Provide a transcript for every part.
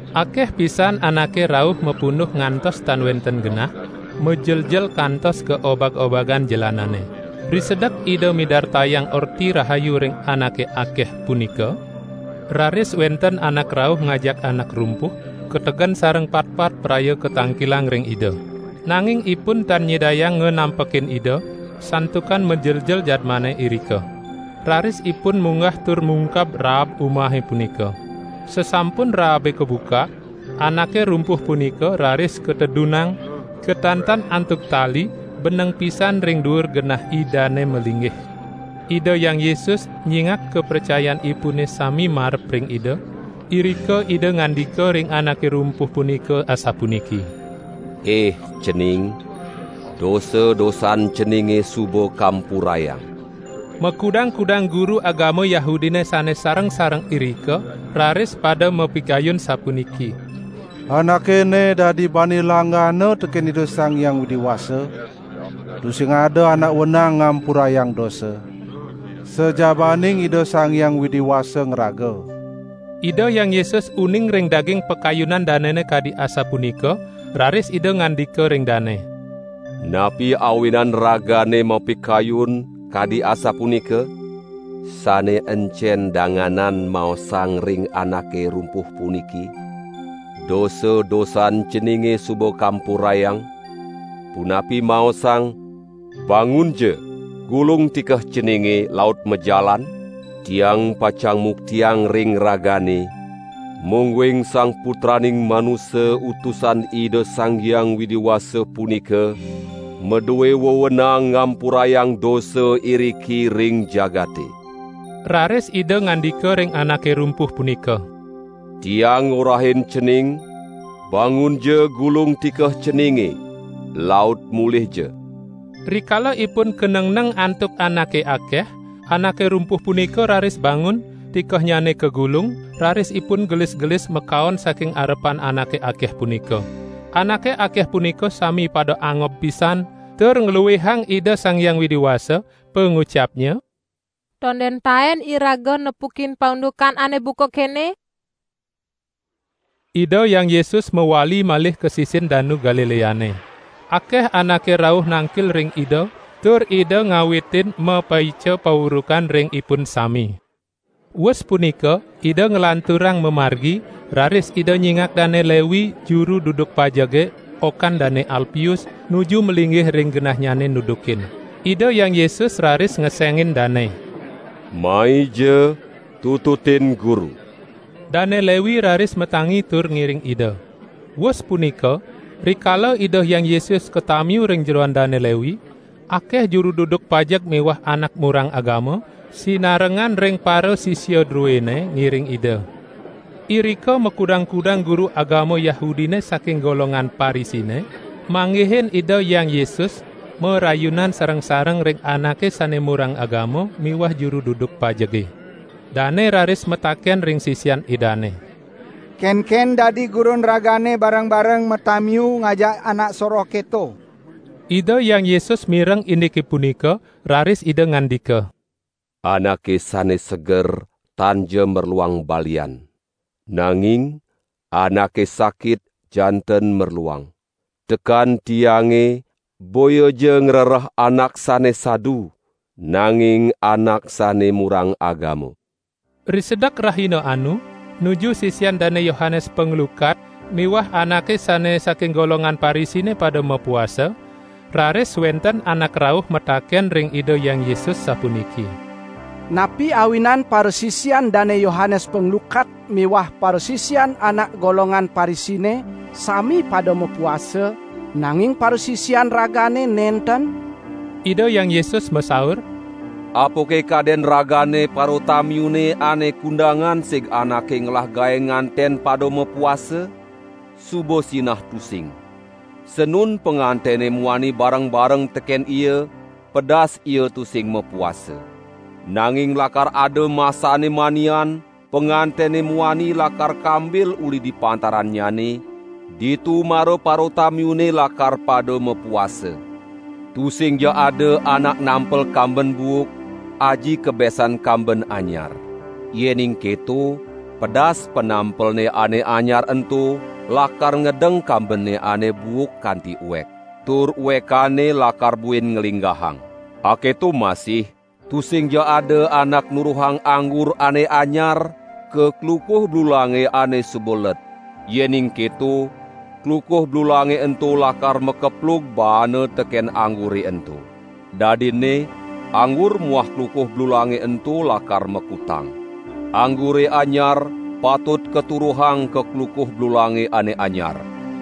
Akeh pisan anake rauh mapunduh ngantos tan wenten genah, majeljel kantos ka obag-obagan jelanane. Risedek Ida midartayang Orti Rahayu ring anake akeh punika, raris wenten anak rauh ngajak anak rumpuh, kategen sareng patpat praya katangkilang ring Ida. Nanging ipun tan nyidayang nganampekin Ida, santukan majeljel jadmane irika. Raris ipun munggah tur mungkah raab umahe punika. Sasampun raabe kabukak, anake rumpuh punika raris katedunang, katantan antuk tali beneng pisan ring duur genah Idane malinggih. Ida Hyang Yesus nyingak kapracayanipune sami marep ring Ida, irika Ida ngandika ring anake rumpuh punika asapuniki: "Ih cening, dosa-dosan ceninge suba kampurayang." Makudang-kudang guru agama Yahudine sane sareng-sareng irika raris pada mapikayun sapuniki: "Anake ene dadi bani langgana teken Ida Sang Hyang Widi Wasa. Tusing ada anak wenang ngampurayang dosa, sajabaning Ida Sang Hyang Widi Wasa ngraga." Ida Hyang Yesus uning ring daging pakayunan danene kadi asapunika, raris Ida ngandika ring dane: "Napi awinan ragane mapikayun kadi asapunika? Sane encen danganan maosang ring anake rumpuh puniki: 'Dosa-dosan ceninge suba kampurayang', punapi maosang: 'Bangunja, gulung tikeh ceninge laut majalan'? Tiang pacang muktiang ring ragane, mungguing Sang Putraning Manusa Utusan Ida Sang Hyang Widi Wasa punika madue wewenang ngampurayang dosa iriki ring jagate." Raris Ida ngandika ring anake rumpuh punika: "Tiang ngorahin cening, bangunja gulung tikeh ceninge, laut mulihja!" Rikala ipun kanengneng antuk anake akeh, anake rumpuh punika raris bangun, tikehnyane kagulung, raris ipun gelis-gelis makaon saking arepan anake akeh punika. Anake akeh punika sami pada angob pisan, tur ngluihang Ida Sang Hyang Widi Wasa, pangucapnya: "Tonden taen iraga nepukin paundukan ane buka kene!" Ida Hyang Yesus mawali malih ka sisin Danu Galileane. Akeh anake rauh nangkil ring Ida, tur Ida ngawitin mapaica paurukan ring ipun sami. Wus punika Ida nglanturang mamargi, raris Ida nyingak Dane Lewi, juru duduk pajege, okan Dane Alpius, nuju malinggih ring genahnyane nudukin. Ida Hyang Yesus raris ngesengin dane: "Maija tututin Guru!" Dane Lewi raris matangi tur ngiring Ida. Wus punika, rikala Ida Hyang Yesus katamiu ring jeroan Dane Lewi, akeh juru duduk pajeg miwah anak murang agama, sinarengan ring parasisia druene, ngiring Ida. Irika makudang-kudang guru agama Yahudine saking golongan Parisine, manggihin Ida Hyang Yesus marayunan sareng-sareng ring anake sane murang agama miwah juru duduk pajege. Dane raris mataken ring sisian Idane: "Kenken dadi Gurun ragane bareng-bareng matamiu ngajak anak soroh keto?" Ida Hyang Yesus mireng indike punika, raris Ida ngandika: "Anake sane seger tanja merluang balian. Nanging anake sakit janten merluang. Tekan Tiange boyaja ngrereh anak sane sadu, nanging anak sane murang agama." Risedek rahina anu, nuju sisian Dane Yohanes Panglukat miwah anake sane saking golongan Parisine pada mapuasa, raris wenten anak rauh mataken ring Ida Hyang Yesus sapuniki: "Napi awinan parasisian Dane Yohanes Panglukat miwah parasisian anak golongan Parisine sami pada mapuasa, nanging parasisian Ragane nenten?" Ida Hyang Yesus masaur: "Apake kaden ragane paratamiune ane kundangan sig anake ngelah gae nganten pada mapuasa? Suba sinah tusing. Sanun pangantene muani bareng-bareng teken ia, pedas ia tusing mapuasa. Nanging lakar ada masanne manian, pangantene muani lakar kambil uli di pantarannyane, ditu mara paratamiune lakar pada mapuasa. Tusingja ada anak nampel kamben buuk aji kebesan kamben anyar. Yening keto pedas panampelne ane anyar ento lakar ngedeng kambene ane buuk kanti uek. Tur uekanne lakar buin nglinggahang. Aketo masih, tusingja ada anak nuruhang anggur ane anyar ka klukuh blulange ane suba let. Yening keto klukuh blulange ento lakar makeplug baana teken anggure ento. Dadinne anggur muah klukuh blulange ento lakar makutang. Anggure anyar patut katuruhang ka klukuh blulange ane anyar."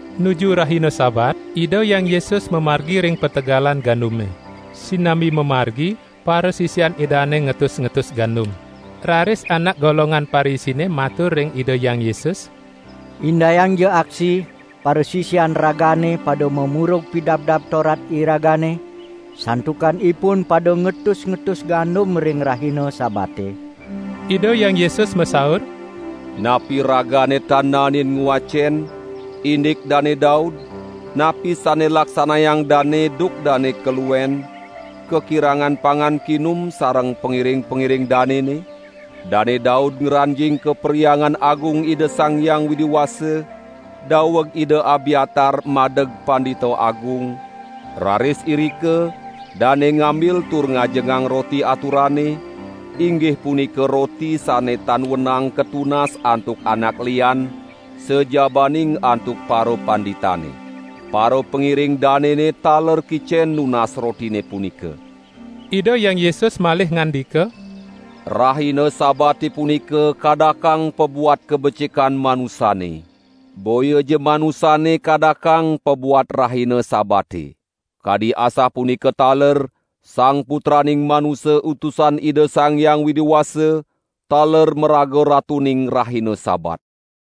Nuju rahina Sabat, Ida Hyang Yesus mamargi ring pategalan gandume. Sinambi mamargi parasisian Idane ngetus-ngetus gandum. Raris anak golongan Parisine matur ring Ida Hyang Yesus: "Indayangja aksi, parasisian Ragane pada mamurug Pidabdab Torat iragane, santukan ipun pada ngetus-ngetus gandum ring rahina Sabate?" Ida Hyang Yesus masaur: "Napi ragane tan naenin ngwacen, indik Dane Daud, napi sane laksanayang dane duk dane kaluen, kakirangan pangan kinum sareng pangiring-pangiring danene? Dane Daud ngranjing ka Perhyangan Agung Ida Sang Hyang Widi Wasa, daweg Ida Abyatar madeg Pandita Agung, raris irika dane ngambil tur ngajengang roti aturane, inggih punika roti sane tan wenang katunas antuk anak lian, sajabaning antuk parapanditane. Parapangiring danene taler kicen nunas rotine punika." Ida Hyang Yesus malih ngandika: "Rahina Sabate punika kadakang pabuat kabecikan manusane. Boyaja manusane kadakang pabuat rahina Sabate. Kadi asapunika taler Sang Putraning Manusa Utusan Ida Sang Hyang Widi Wasa, taler maraga Ratuning rahina Sabat."